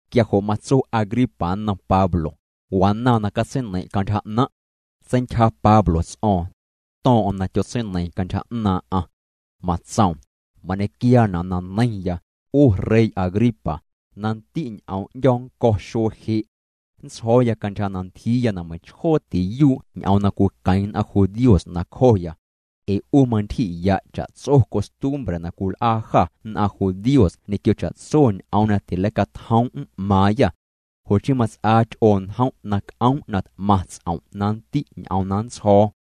Quia jo' matso Agripa nnom Pablo: —Wanaaⁿ na catseineiⁿ' cantyja 'naⁿ'. Seintyja Pablo ts'o̱o̱ⁿ. To̱o̱ⁿ'o̱ⁿ na tyotseineiiⁿ cantyja 'naaⁿ'aⁿ. Matsoom: —Mañequiaana' na neiⁿya, 'u rey Agripa, na nndi' ñ'oom 'ndyo̱ nnco̱ xuee je'. Nntsjo̱o̱ya cantyja na ntyjiiya na meiⁿchjoo tiyuu' ñ'oom na cwiqueⁿ nn'aⁿ judíos nacjoya. Ee 'u mantyji'ya' cha'tso costumbre na cwil'aa jâ nn'aⁿ judíos ñequio cha'tso ñ'oom na tileicatjoom' m'maaⁿyâ. Jo' chii mats'aa ty'oo njom' na c'oom' na t'maⁿ ts'om' na nndi' ñ'oom na nntsjo̱o̱.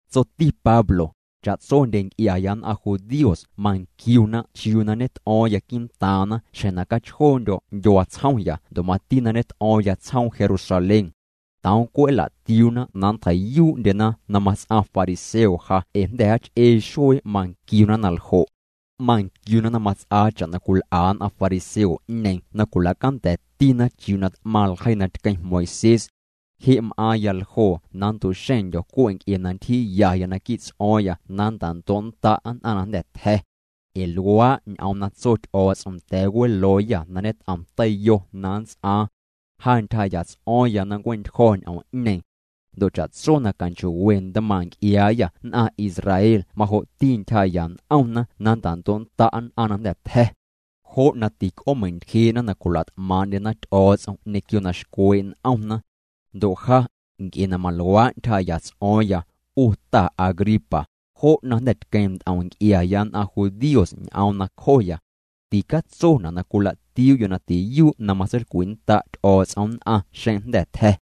Tsoti Pablo: —Cha'tsondye nc'iaya nn'aⁿ judíos manquiuyana chiuu na ñet'o̱o̱ⁿya quii'ntaaⁿna xjeⁿ na cachjoondyo̱ ndyuaa tsjomya ndo' mati na ñet'o̱o̱ⁿya tsjoom Jerusalén. Toom cwe' nla'tiuuna na nntjei'yuu'ndyena na mats'aⁿ fariseo ja ee jnda̱ jaach'ee xuee manquiuna na ljo'. Manquiuna na mats'aa cha'na cwil'a nn'aⁿ fariseo'ñeeⁿ na cwila'canda̱tina chiuu na t'maⁿ ljeii na tqueⁿ Moisés. Je' m'aaⁿya ljoo na nntu'xeⁿndyo̱ cwe' ee ntyjiiyaya naquii' ts'o̱o̱ⁿya na nnta'ndo'nnda' nn'aⁿ na jnda̱ tja̱. Ee luaa' ñ'oom na tso Ty'o̱o̱ts'om nda̱a̱ welooyâ na ñet'om teiyo na nnts'aaⁿ. Ja ntyjaa'ya ts'o̱o̱ⁿya na nncue'ntyjo̱ ñ'oom'ñeeⁿ. Ndo' cha'tso na canchoo'we ntmaaⁿ' nc'iaayâ nn'aⁿ Israel majo'ti ntyjaa'ya n'omna na nnta'ndo'nnda' nn'aⁿ na jnda̱ tja̱. Jo' na tic'oomeintyjee'na na cwila't'maaⁿ'ndyena Ty'o̱o̱ts'om ñequio na xcwee' n'omna. Ndo' ja, nc'e na maluaa' ntyjaa'ya ts'o̱o̱ⁿya, 'u ta Agripa, jo' na jnda̱ tqueⁿ nt'om nc'iaya nn'aⁿ judíos ñ'oom nacjoya. Ticatsona' na cwila'tiuu'yo' na tiyuu' na matseilcwinnda' Ty'o̱o̱ts'om nn'aⁿ xeⁿ jnda̱ tja̱.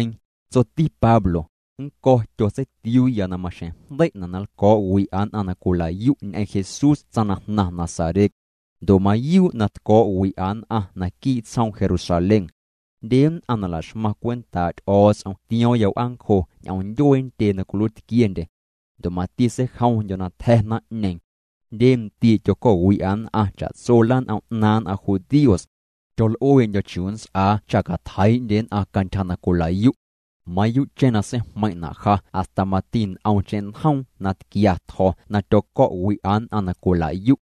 Tsoti Pablo: —Nnco̱ tyotseitiuuya na maxjeⁿ jndei'na' na nlco̱o̱'wi'a nn'aⁿ na cwila'yu' ñ'eⁿ Jesús tsaⁿ na jnaⁿ Nazaret. Ndo' mayuu' na tco̱o̱'wi'a nn'aⁿ naquii' tsjoom Jerusalén. Jndye nn'aⁿ na la'xmaⁿ cwentaa' Ty'o̱o̱ts'om tio̱o̱ⁿya w'aancjo ñ'oom ndyuee ntyee na cwiluiitquiendye. Ndo' mati seijomndyo̱ na tja̱ naⁿ'ñeeⁿ. Jndye ndii' tyoco̱'wi'a nn'aⁿ cha'tso lan'om 'naaⁿ nn'aⁿ judíos. Tyol'uee'ndyo̱ chiuu nnts'aa cha catjeii'ndye nn'aⁿ cantyja na cwila'yu'. Mayuu'cheⁿ na seijmeiⁿ'na' ja hasta mati nt'omcheⁿ njoom na tquia tjo̱ na tyoco̱'wi'a nn'aⁿ na cwila'yu'.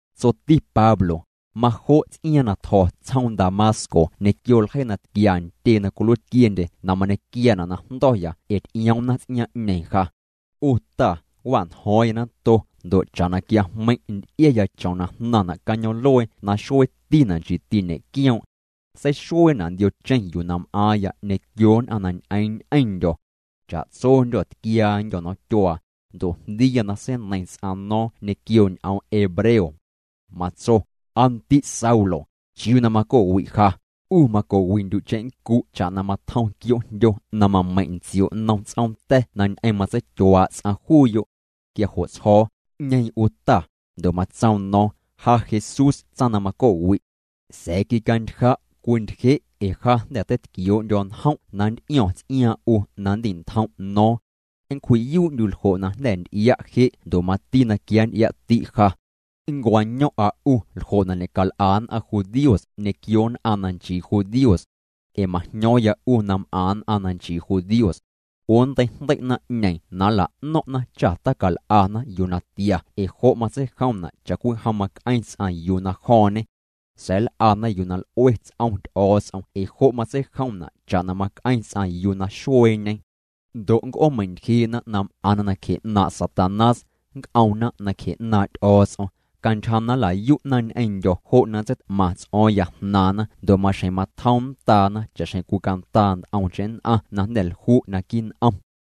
Tsoti Pablo: —Majo' ts'iaaⁿ na tjo̱ tsjoom Damasco ñequio ljeii na tquia ntyee na cwiluiitquiendye na mañequiaana' na jndo̱ya ee ty'ioomna ts'iaaⁿ'ñeeⁿ ja. 'U ta, wa'njo̱o̱ⁿya nato, ndo' cha'na quiajmeiⁿ' nty'iaya chom na jnaⁿna' cañoom'luee na xueetina' nchiiti ñe'quioom'. Seixueena' ndiocheⁿ yuu m'aaⁿya ñequio nn'aⁿ na ñ'eeⁿ ñ'eⁿndyo̱. Cha'tsondyô̱ tquiaandyô̱ nomtyuaa, ndo' jndiiya na seineiⁿ ts'aⁿ no̱o̱ⁿ ñequio ñ'oom hebreo. Matso: “Aa ndi' Saulo, ¿chiuu na maco'wi' ja? 'U maco'wi'ndyu' cheⁿnncu' cha'na matjom quioo'jndyo na mameiⁿ' ntsio' nnom ts'oom ta̱ na ñ'eⁿ matseityuaa' ts'aⁿ juuyo'.” Quia jo' tsjo̱o̱: “¿'Ñeeⁿ 'u Ta?” Ndo' matsoom no̱o̱ⁿ: “Ja Jesús tsaⁿ na maco'wi'. Sa̱a̱ quicantja', cwintyje', ee ja jnda̱ teitquioo'ndyo̱ njom' na nnt'io̱ⁿ ts'iaaⁿ 'u na nndi'ntjom' no̱o̱ⁿ. Nncwji'yuu'ndyu' ljo' na jnda̱ nty'ia' je' ndo' mati na quia nnty'ia'ti' ja. Nncwaño̱o̱ⁿ'a 'u ljo' na ñe'cal'a nn'aⁿ judíos ñequio nn'aⁿ na nchii judíos. Ee majño̱o̱ⁿya 'u na m'aⁿ nn'aⁿ na nchii judíos. 'U nntei'jndei' naⁿ'ñeeⁿ na nla'no̱ⁿ'na cha tacal'ana yuu na tia ee jo' matseijomna' cha'cwijom mac'eⁿ ts'aⁿ yuu na jo̱o̱ⁿñe. Sa̱a̱ nl'ana yuu na l'ue ts'om Ty'o̱o̱ts'om ee jo' matseijomna' cha'na mac'eⁿ ts'aⁿ yuu na xueeñe. Ndo' nnc'oomeintyjee'na na m'aⁿna nacje 'naaⁿ' Satanás, nnc'omna nacje 'naaⁿ' Ty'o̱o̱ts'om. Cantyja na nla'yu'na ñ'eⁿndyo̱ jo' na nntseit'maⁿ ts'o̱o̱ⁿya jnaaⁿna ndo' maxjeⁿ matjom nndaana cha'xjeⁿ cwicandaa nt'omcheⁿ nn'aⁿ na jnda̱ lju' naquii' n'om.”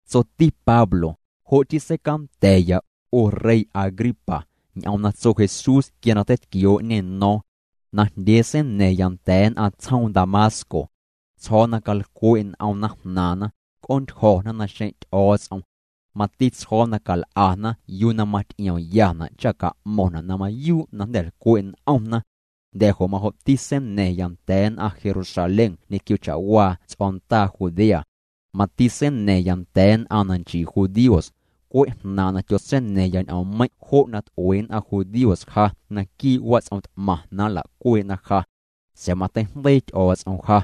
Tsoti Pablo: —Jo' chii seicanda̱ya, 'u rey Agripa, ñ'oom na tso Jesús quia na teitquioo'ñê no̱o̱ⁿ. Najndyee seina̱a̱ⁿya nda̱a̱ nn'aⁿ tsjoom Damasco. Tsjo̱o̱ na calcwe' n'omna jnaaⁿna, c'oontyjo̱na naxeⁿ' Ty'o̱o̱ts'om. Mati tsjo̱o̱ na cal'ana yuu na maty'iomyana' cha ca'mo̱ⁿna' na mayuu' na jnda̱ lcwe' n'omna. Jnda̱ jo' majo'ti seina̱ⁿya nda̱a̱ nn'aⁿ Jerusalén ñequio cha'waa ts'o̱ndaa Judea. Mati seina̱ⁿya nda̱a̱ nn'aⁿ na nchii judíos. Cwe' jnaaⁿ' na tyotseina̱ⁿya ñ'oommeiⁿ' jo' na t'ue nn'aⁿ judíos ja naquii' wats'om t'maⁿ na nla'cuee'na ja. Sa̱a̱ mateijndeii Ty'o̱o̱ts'om ja.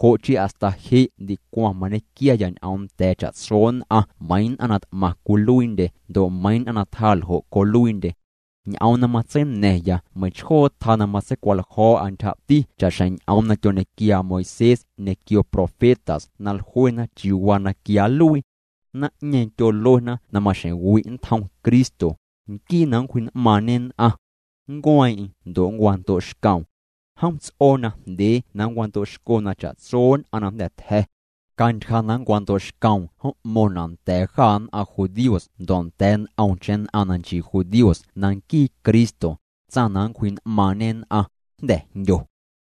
Jo' chii hasta je' ndicwaⁿ mañequiaya ñ'oom nda̱a̱ cha'tso nn'aⁿ meiiⁿ nn'aⁿ na t'maⁿ cwiluiindye ndo' meiiⁿ nn'aⁿ na tjaa ljo' coluiindye. Ñ'oom na matseina̱ⁿya meiⁿchjoo tjaa na matseicwaljo̱o̱'a ntyjati cha'xjeⁿ ñ'oom na tyoñequiaa Moisés ñequio profetas na jluena chiuu waa na quia nluii. Naⁿ'ñeeⁿ tyoluena na maxjeⁿ wi' nntjom Cristo, nquii na nncwji'n'maaⁿñe nn'aⁿ. Nncueeⁿ'eⁿ ndo' nncwando'xcoom. Jom ts'oo najndyee na nncwando'xco na cha'tso nn'aⁿ na jnda̱ tja̱. Cantyja na nncwando'xcoom m'mo̱ⁿna' nda̱a̱ jâ nn'aⁿ judíos ndo' nda̱a̱ nt'omcheⁿ nn'aⁿ na nchii judíos na nquii Cristo, tsaⁿ na nncwji'n'maaⁿñe nn'aⁿ, jnda̱ jndyo.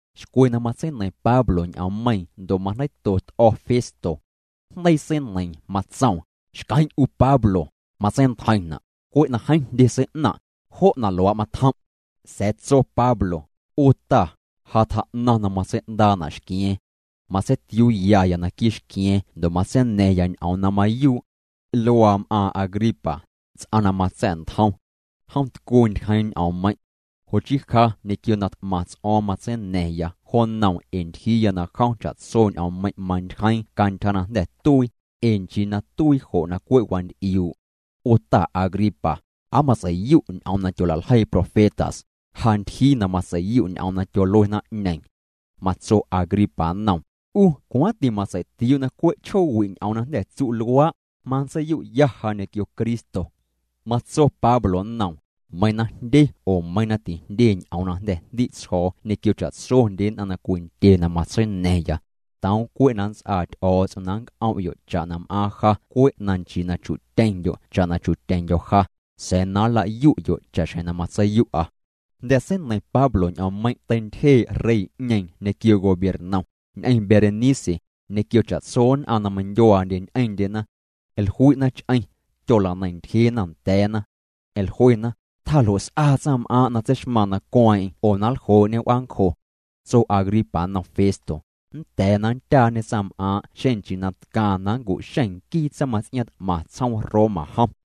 Xcwe na matseineiⁿ Pablo ñ'oommeiiⁿ ndo' majndeiito t'o̱ Festo. Jndeii seineiiⁿ matsoom: —Xqueⁿ' 'u Pablo, matseintjeiⁿna', cwe' na jeeⁿ jndye sei'naⁿ', jo' na luaa' matjom'. Sa̱a̱ tso Pablo: —'U ta, ja tjaa'naⁿ na matsei'ndaa'na' xqua̱a̱ⁿ. Matseitiuuyaya naquii' xqua̱a̱ⁿ ndo' matseina̱ⁿya ñ'oom na mayuu'. Luaa m'aaⁿ Agripa, ts'aⁿ na matsa̱'ntjom. Jom tcuu ntyjeeⁿ ñ'oommeiⁿ'. Jo' chii ja ñequio na t'maⁿ ts'o̱o̱ⁿ matseina̱ⁿya jo nnoom ee ntyjiiya na jom cha'tso ñ'oommeiⁿ' mantyjeeⁿ cantyja na jnda̱ tuii, ee nchii na tuii jo' na cwe' wanty'iuu'. 'U ta Agripa, ¿aa matsei'yu' ñ'oom na tyola'ljeii profetas? Ja ntyjii na matsei'yu' ñ'oom na tyolue naⁿ'ñeeⁿ. Matso Agripa nnoom: —'U cwaaⁿti matsei'tiuu' na cwe' chjoowi' ñ'oom na jnda̱ tsu' luaa', manntseiyu'ya ja ñequio Cristo. Matso Pablo nnom: —Meiiⁿ na jndye oo meiiⁿ na tijndye ñ'oom na jnda̱ jndi' tsjo̱o̱ ñequio cha'tsondye nn'aⁿ na cwindye na matseina̱ⁿya, toom cwe' na nnts'aa Ty'o̱o̱ts'om na nc'om'yo' cha'na m'aaⁿ ja cwe' na nchii na chu'tyeⁿndyo' cha'na chu'tyeⁿndyo̱ ja, sa̱a̱ na nlayu'yo' cha'xjeⁿ na matseiyu'a. Jnda̱ seineiⁿ Pablo ñ'oommeiⁿ' teintyjee' rey'ñeeⁿ ñequio gobiernom, ñ'eⁿ Berenice, ñequio cha'tso nn'aⁿ na meindyuaandye ñ'eⁿndyena. Jlui'na ch'eⁿ. Tyola'neiⁿ ntyjeena nda̱a̱na. Jluena: —Tjaa ljo' s'aa tsaⁿm'aaⁿ' na tseixmaaⁿ na nncueeⁿ'eⁿ oo na nljoo'ñê w'aancjo. Tso Agripa nnom Festo: —Nnda̱a̱ na nndyaañe tsaⁿm'aaⁿ' xeⁿ nchii na tcaaⁿ na nncu'xeⁿ nquii tsaⁿmaⁿts'iaaⁿ t'maⁿ tsjoom Roma jom.